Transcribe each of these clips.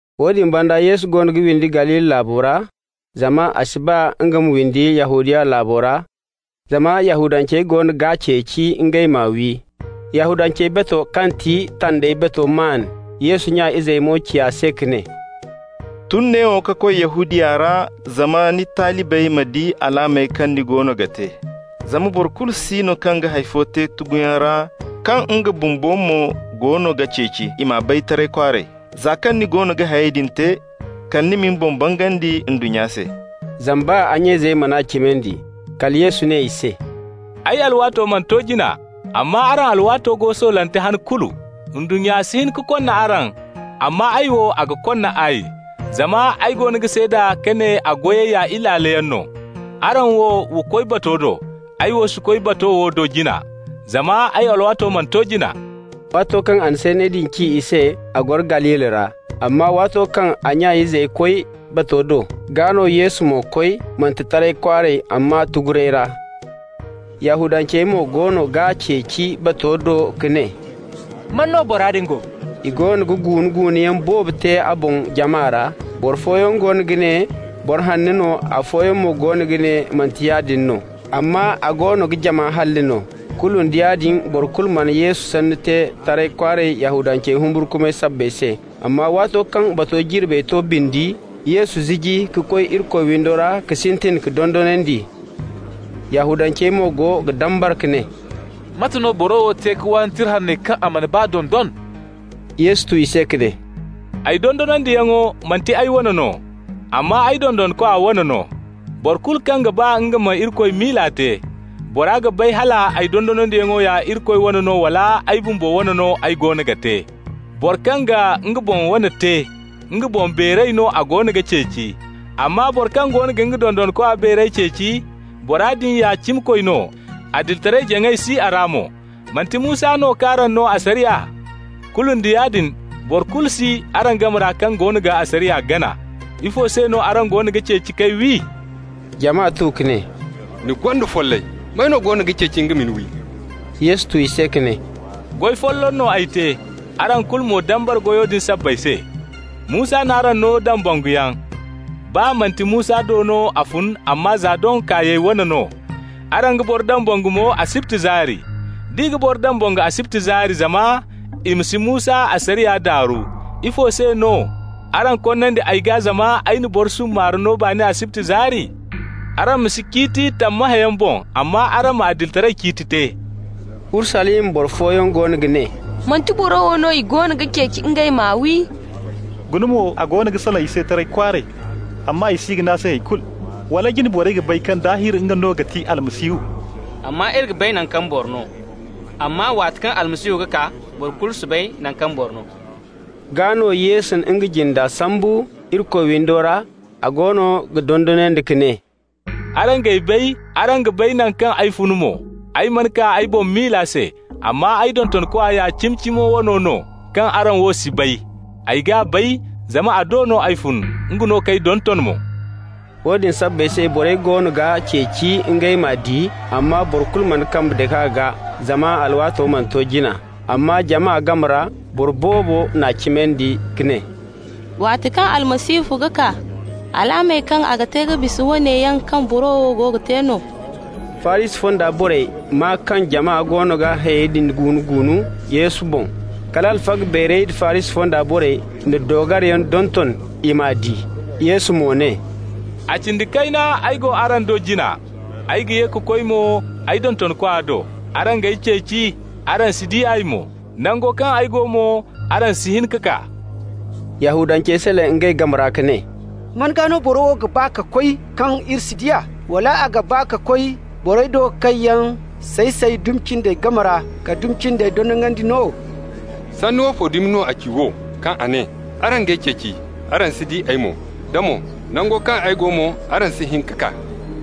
Woodin banda Yesu goono ga windi Galili laabo ra, zama a si ba nga ma windi Yahudiya laabo ra, zama Yahudancey goono ga ceeci ngey m'a wi. Yahudancey batu kaŋ ti Tandey Bato maan. Yesu nya izey mo ci a se ka ne: «Tun neewo ka koy Yahudiya ra zama ni talibey ma di alaamey kaŋ ni goono ga te. Zama boro kulu si no kaŋ ga hay fo te tuguyaŋ ra kaŋ nga bumbo mo goono ga ceeci i m'a bay taray kwaaray. Za kaŋ ni goono ga hayey din te, kala ma ni boŋ bangandi ndunnya se.» Zama baa a nya izey man'a cimandi. Kala Yesu ne i se: «Ay alwaato mana to jina, amma araŋ alwaato go soolante han kulu. Ndunnya si hin ka konna araŋ, amma ay wo, a ga konna ay, zama ay goono ga seeda ka ne a goyey ya ilaaloyaŋ no. Araŋ wo, wa koy bato do. Ay wo si koy bato wo do jina, zama ay alwaato mana to jina.» Waato kaŋ a na sanney din ci i se, a goro Galili ra. Amma waato kaŋ a nya izey koy bato do, gaa no Yesu mo koy, manti taray kwaaray, amma tuguyaŋ ra. Yahudancey mo goono g'a ceeci bato do ka ne: «Man no bora din go?» I goono ga guunu-guunuyaŋ boobo te a boŋ jama ra. Boro fooyaŋ goono ga ne boro hanno no, afooyaŋ mo goono ga ne manti yaadin no, amma a goono ga jama halli no. Kulu nda yaadin, boro kulu mana Yesu sanno te taray kwaaray, Yahudancey humburkumay sabbay se. Amma waato kaŋ bato jirbey to bindi, Yesu ziji ka koy Irikoy windo ra ka sintin ka dondonandi. Yahudancey mo go ga dambara ka ne: «Mate no boro wo te ka waani Tira Hanney kaŋ a mana baa dondon?» Yesu tu i se ka ne: «Ay dondonandiyaŋo manti ay wane no, amma ay dontonkwa wane no. Boro kulu kaŋ ga ba nga ma Irikoy miila te, bora ga bay hal ay dondonandiyaŋo ya Irikoy wane no wala ay bumbo wane no ay goono ga te. Boro kaŋ ga nga boŋ wane te, nga boŋ beeray no a goono ga ceeci, amma boro kaŋ goono ga nga dontonkwa beeray ceeci, bora din ya cimikoy no, adilitaray-jaŋay si a ra mo. Manti Musa no k'araŋ no asariya? Kulu nda yaadin boro kulu si araŋ game ra kaŋ goono ga asariya gana. Ifo se no araŋ goono ga ceeci k'ay wi?» Jama tu ka ne: «Ni gonda follay! May no goono ga ceeci nga ma ni wi?» Yesu tu i se ka ne: «Goy folloŋ n'ay te, araŋ kulu mo dambara goyo din sabbay se. Musa n'araŋ no dambanguyaŋ (baa kaŋ manti Musa do no a fun, amma za doŋ kaayey wane no). Araŋ ga boro dambangu mo asibti zaari. D'i ga boro dambangu asibti zaari zama i ma si Musa asariya daaru, ifo se no araŋ konnandi ay gaa zama ay na boro summaare no baani asibti zaari? Araŋ ma si ciiti tammahãyaŋ boŋ, amma araŋ ma adilitaray ciiti te.» Urusalima boro fooyaŋ goono ga ne: «Manti boro wo no i goono ga ceeci ngey ma wi? Guna mo, a goono ga salaŋ i se taray kwaaray, amma i si ga ne a se hay kulu. Wala jine borey ga bay kaŋ daahir nga no ga ti Almasihu? Amma iri ga bay naŋ kaŋ boro no, amma waati kaŋ Almasihu ga kaa, boro kulu si bay naŋ kaŋ boro no.» Gaa no, Yesu na nga jinde sambu Irikoy windo ra, a goono ga dondonandi ka ne: «Araŋ g'ay bay, araŋ ga bay naŋ kaŋ ay fun mo. Ay mana kaa ay boŋ miila se, amma ay dontonkwa ya cimi-cimo wano no, kaŋ araŋ wo si bay. Ay g'a bay, zama a do no ay fun, nga no k'ay donton mo.» Woodin sabbay se borey goono ga ceeci ngey m'a di, amma boro kulu mana nga kambe dake a gaa, zama a alwaato mana to jina. Amma jama game ra boro boobo n'a cimandi ka ne: «Waati kaŋ Almasihu ga kaa, alaamey kaŋ a ga te ga bisa woone yaŋ kaŋ boro wo te no?» Farisi fonda borey maa kaŋ jama goono ga hayey din guunu-guunu Yesu boŋ. Kala alfaga beerey da Farisi fonda borey na doogariyaŋ donton i m'a di. Yesu mo ne: «A cindi kayna ay go araŋ do jina, ay ga ye ka koy mo ay dontonkwa do. Araŋ g'ay ceeci, araŋ si di ay mo. Nango kaŋ ay go mo, araŋ si hin ka kaa.» Yahudancey salaŋ ngey game ra ka ne: «Man gaa no boro wo ga ba ka koy kaŋ iri si di a? Wala a ga ba ka koy borey do kaŋ yaŋ say-say dumi cindey game ra ka dumi cindey dondonandi no? Sanni woofo dumi no a ci wo, kaŋ a ne: ‹Araŋ g'ay ceeci, araŋ si di ay mo,› da mo: ‹Nango kaŋ ay go mo, araŋ si hin ka kaa›?»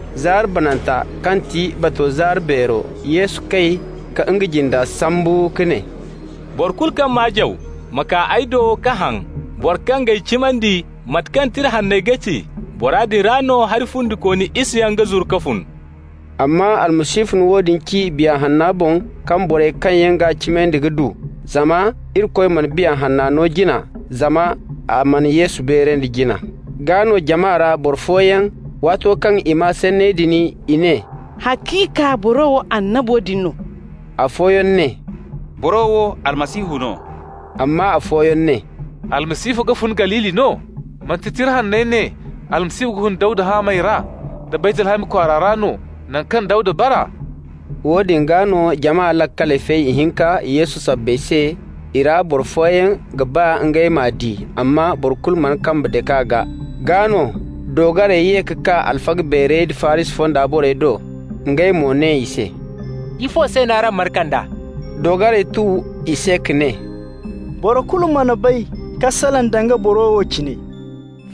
Zaari bananta kaŋ ti bato zaari beero ra, Yesu kay ka nga jinda sambu ka ne: «Boro kulu kaŋ maa jaw ma kaa ay do ka haŋ! Boro kaŋ g'ay cimandi, mate kaŋ Tira Hanney ga ci, bora din ra no hari fundikooni isayaŋ ga zuru ka fun.» Amma Almasihu na woone ci Biya Hanno boŋ kaŋ borey kaŋ yaŋ g'a cimandi ga du, zama Irikoy mana Biya Hanno no jina, zama a mana Yesu beerandi jina. Gaa no, jama ra boro fooyaŋ, waato kaŋ i maa sanney din, i ne: «Haciika, boro wo annabo din no.» Afooyaŋ ne: «Boro wo Almasihu no.» Amma afooyaŋ ne: «Almasihu ga fun Galili no? Manti Tira Hanney ne Almasihu ga fun Dawda haamey ra nda Baytlahami kwaara ra no, naŋ kaŋ Dawda bara?» Woodin gaa no jama laakaley fay ihinka Yesu sabbay se. I ra boro fooyaŋ ga ba ngey m'a di, amma boro kulu mana kambe dake a gaa. Gaa no, doogarey ye ka kaa alfaga beerey da Farisi fonda borey do. Ngey mo ne i se: «Ifo se no araŋ mana kand'a?» Doogarey tu i se ka ne: «Boro kulu mana bay ka salaŋ danga boro wo cine.»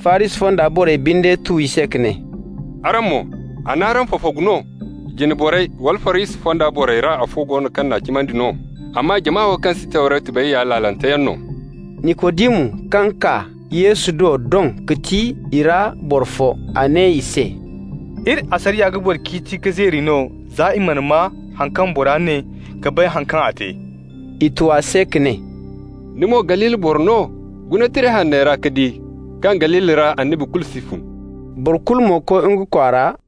Farisi fonda borey binde tu i se ka ne: «Araŋ mo, a n'araŋ fafagu no? Jine borey wala Farisi fonda borey ra boro fo go no kaŋ n'a cimandi no? Amma jama wo kaŋ si Tawretu bay ya laalante yaŋ no.» Nikodimu kaŋ kaa Yesu do doŋ ga ti i ra boro fo. A ne i se: «Iri asariya ga boro ciiti ka zeeri no za i mana maa haŋ kaŋ bora ne ka bay haŋ kaŋ a te?» I tu a se ka ne: «Ni mo Galili boro no? Guna Tira Hanney ra ka di kaŋ Galili ra annabi kulu si fun.» Boro kulu mo koy nga kwaara,